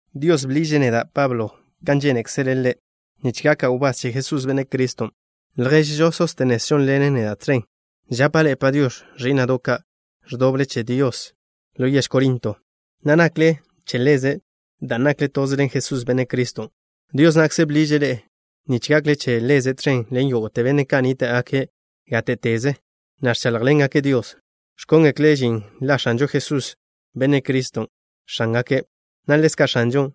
Dios bḻiže' neda', Pablo, kan žénekzele' Ḻe', nich gaka' wbás che Jesús, Benne' Criston'. Lježžo Sóstenes žónḻene' neda' tẕen. Žapa' ḻe'e “Padiox̱” ẕí'na'do' ka', ẕdoble che Dios ḻo yež Corinto, na' nakle che Ḻeze' dan' nakle toze ḻen Jesús, Benne' Criston'. Dios na'kze bḻiže' ḻe'e nich gakle che Ḻeze' tẕen ḻen yógo'te benne' ka' nníta'gake' gáte'teze, na' ẕcháḻjḻengake' Dios, ẕkóngekle' žin la X̱anžo Jesús, Benne' Criston', X̱ángake', na' ḻezka' X̱anžo.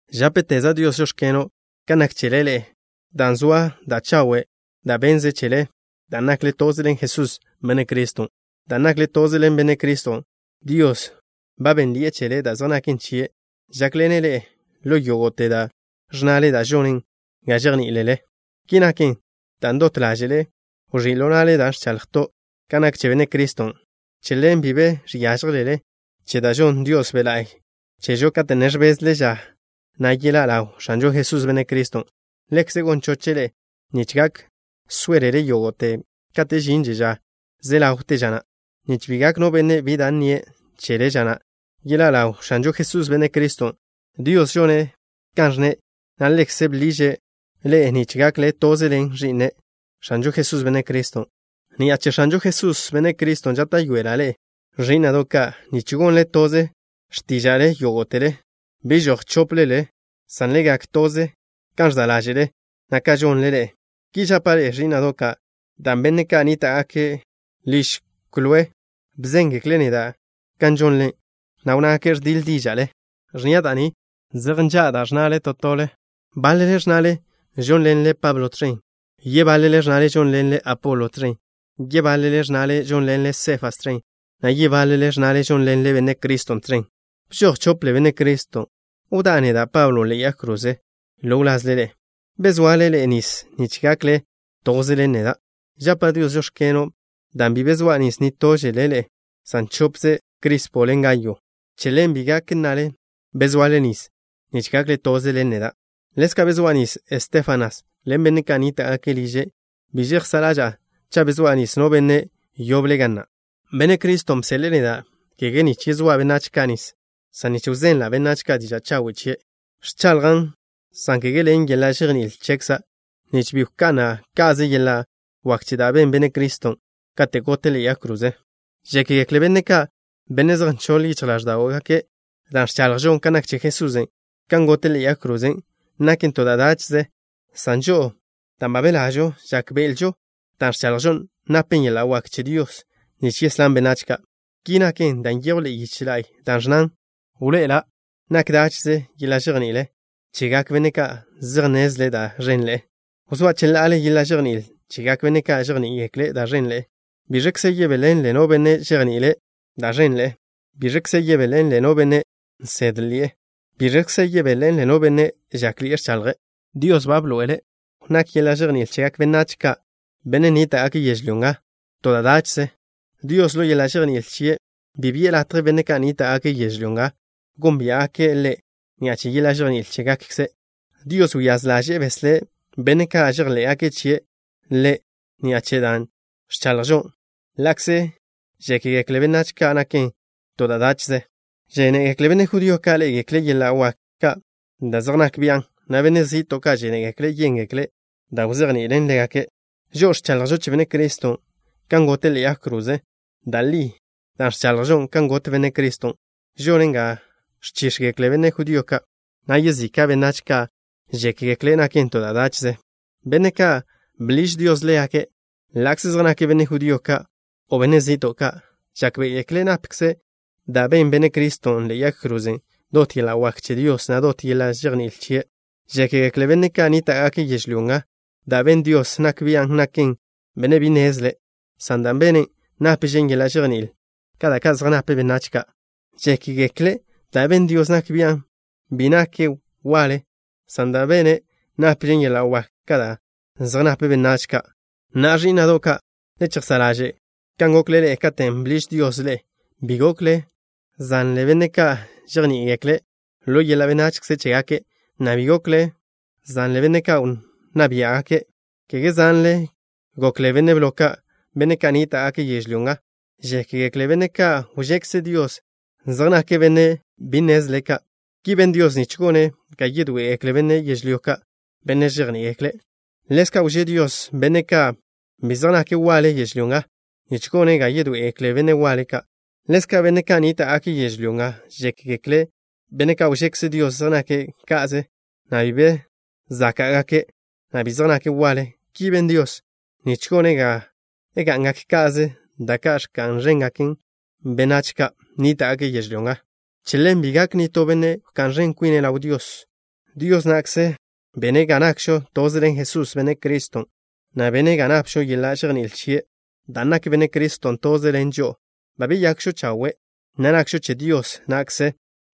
Žápeteza' Dios: “Žóx̱keno'” kan nak chele ḻe'e, dan' zoa da' chawe' da' bennze' chele dan' nakle toze ḻen Jesús, Benne' Criston'. Dan' nakle toze ḻen Benne' Criston', Dios ba bénnḻi'e chele da' zej naken chie'. Žákḻene' ḻe'e ḻo yógo'te da' ẕnnale, na' žone' ga žejní'iḻe'elele. Ki naken dan' dot ḻáže'le wẕí' ḻo na'le da' ẕchaḻjto' kan nak che Benne' Criston'. Che ḻen, bi be žiážjelele che da' žonn Dios Be' La'y chežo, kate' ne ẕbezle ža na' yeḻá' ḻaw X̱anžo Jesús, Benne' Criston'. Ḻekze' gon choche' ḻe'e nich gak sóelele yógo'te kate' žinže ža ze ḻawte ža na', nich bi gak no benne' bi da' nnie' chele ža na' yeḻá' ḻaw X̱anžo Jesús, Benne' Criston'. Dios žone' kan ẕnne', na' Ḻekze' bḻiže' ḻe'e nich gakle toze ḻen Ẕi'ne', X̱anžo Jesús, Benne' Criston'. Ni'a che X̱anžo Jesús, Benne' Criston', žáta'yoela' ḻe'e, ẕí'na'do' ka', nich gonle toze x̱tíža'le yógo'tele. Bi žoj chóplele, san le gak toze kan ẕza' ḻáže'le, na' kan žonle ḻe'e. Ki žapa' ḻe'e, ẕí'na'do' ka', dan' benne' ka' nníta'gake' liž Kloé bzéngekle' neda' kan žonle, na' wnnágake' ẕdiḻ díža'le. Ẕnnia' da' ni: zej nža' da' ẕnnale to tole. Báḻele ẕnnale žónḻenle Pablo tẕen. Yebáḻele ẕnnale žónḻenle Apolo tẕen. Yebáḻele ẕnnale žónḻenle Sefas tẕen, na' yebáḻele ẕnnale žónḻenle Benne' Criston' tẕen. ¿Bžoj chople Benne' Criston'? ¿Wdá' neda', Pablo, ḻe'e yag kroze ḻo wlazle ḻe'e? ¿Bezoale ḻe'e nis nich gakle toze ḻen neda'? Žapa' Dios: “Žóx̱keno'” dan' bi bezóa' nis nitóžele ḻe'e, san chopze Crispo ḻen Gayo. Che ḻen bi gak nnale bezoale nis nich gakle toze ḻen neda'. Ḻezka' bezóa' nis Estéfanas ḻen benne' ka' nníta'gake' liže'. Bi žejsá' ḻaža'a cha' bezóa' nis no benne' yoble ga na'. Benne' Criston' bseḻe'e neda', kege nich yezóa' benách ka' nis, san nich wzenla' benách ka' diža' chawe' chie'. Ẕchaḻjan', san kege ḻen yeḻa' žejní'il chekza', nich bi wka'na' ka'ze yeḻa' wak che da' ben Benne' Criston' katen' gote' ḻe'e yag kroze. Žékgekle benne' ka', benne' zej nchoḻ yichj ḻáẕdo'gake', da' ẕchaḻjžo kan nak che Jesús, kan gote' ḻe'e yag kroze, naken to da' dáche'ze, san žo'o, dan' ba belažo, žákbe'elžo dan' ẕchaḻjžon napen yeḻa' wak che Dios nich yeslán benách ka'. Ki naken dan' nyejw ḻe'e yiche la'y da' ẕnnan: Wḻoe'ela' ḻaw nak dáche'ze yeḻa' žejní'il chegak benne' ka' zej nnezle' da' ẕenḻe'e. Wzóa' cheḻa'ale yeḻa' žejní'il chegak benne' ka' žejní'igekle' da' ẕenḻe'e. ¿Biẕkze yebéḻenle no benne' žejni'ile' da' ẕenḻe'e? ¿Biẕkze yebéḻenle no benne' nsédḻi'e? ¿Biẕkze yebéḻenle no benne' žákḻi'e ẕchaḻje'? Dios ba bḻoe'ele' ḻaw nak yeḻa' žejní'il chegak benách ka', benne' nníta'gake' yežlyó nga, to da' dáche'ze. Dios, ḻo yeḻa' žejní'il chie', bi bi'e latje benne' ka' nníta'gake' yežlyó nga gónbia'gake' Ḻe' ni'a che yeḻa' žejní'il chégakkze'. Dios wyáz ḻaže'e beslé' benne' ka' žejḻé'gake' chie' Ḻe' ni'a che dan' ẕchaḻjžon, ḻa'kze žékgekle benách ka' naken to da' dáche'ze. Žénegekle benne' judío ka' ḻé'egekle' yeḻa' wak ka' da' zej nak bian', na' benne' zi'to' ka' žénegekle' yéngekle' da' wzejni'ilen ḻégake'. Žo'o ẕchaḻjžo che Benne' Criston', kan gote' ḻe'e yag kroze. Da' li, dan' ẕchaḻjžon kan got Benne' Criston', žonen ga ẕchíx̱gekle benne' judío ka', na' yezika' benách ka' žékgekle' naken to da' dáche'ze. Benne' ka' bḻiž Dios ḻégake', ḻa'kze zej nake' benne' judío ka', o benne' zi'to' ka', žákbe'egekle' napkze da' ben Benne' Criston' ḻe'e yag kroze dot yeḻa' wak che Dios, na' dot yeḻa' žejní'il chie'. Žékgekle benne' ka' nníta'gake' yežlyó nga da' ben Dios nak bian' nake' benne' bi nnezle, san dan' bene' nápežen yeḻa' žejní'il ka da' zej nape benách ka'. Žékgekle' da' ben Dios nak bian' bi nake' waḻe, san dan' bene' nápežen yeḻa' wak ka da' zej nape benách ka'. Na'a, ẕí'na'do' ka', le chejsá' ḻaže' kan gokle ḻe'e katen' bḻiž Dios ḻe'e. Bi gokle zanle benne' ka' žejní'igekle' ḻo yeḻa' benachze chégake', na' bi gokle zanle benne' wnná bia' ka', na' kege zanle gokle benne' blo ka'. Benne' ka' nníta'gake' yežlyó nga žékgekle' benne' ka' wžekze Dios zej nake' benne' bi nnezle ka'. Ki ben Dios nich gone' ga yedoé'egekle benne' yežlyó ka', benne' žejní'igekle'. Ḻezka' wžé Dios benne' ka' bi zej nake' waḻe yežlyó nga nich gone' ga yedoé'egekle benne' waḻe ka'. Ḻezka', benne' ka' nníta'gake' yežlyó nga žékgekle' benne' ka' wžekze Dios zej nake' ka'ze, na' bi be záka'gake', na' bi zej nake' waḻe. Ki ben Dios nich gone' ga ga'ngak ka'ze da' ka' ẕka'n ẕengak benne' ka' nníta'gake' yežlyó nga. Che ḻen, bi gak nitó benne' wká'n ẕen kwine' ḻaw Dios. Dios na'kze bene' ga nakžo toze ḻen Jesús, Benne' Criston', na' bene' ga napžo yeḻa' žejní'il chie'. Dan' nak Benne' Criston' toze ḻen žo'o, ba beyakžo chawe', na' nakžo che Dios na'kze,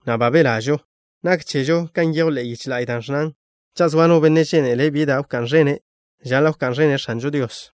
na' belažo. Nak chežo kan nyejw ḻe'e yiche la'y, da' ẕnnan: “Cha' zoa no benne' žénele' bi da' wká'n ẕene', žaḻa' wká'n ẕene' X̱anžo Dios.”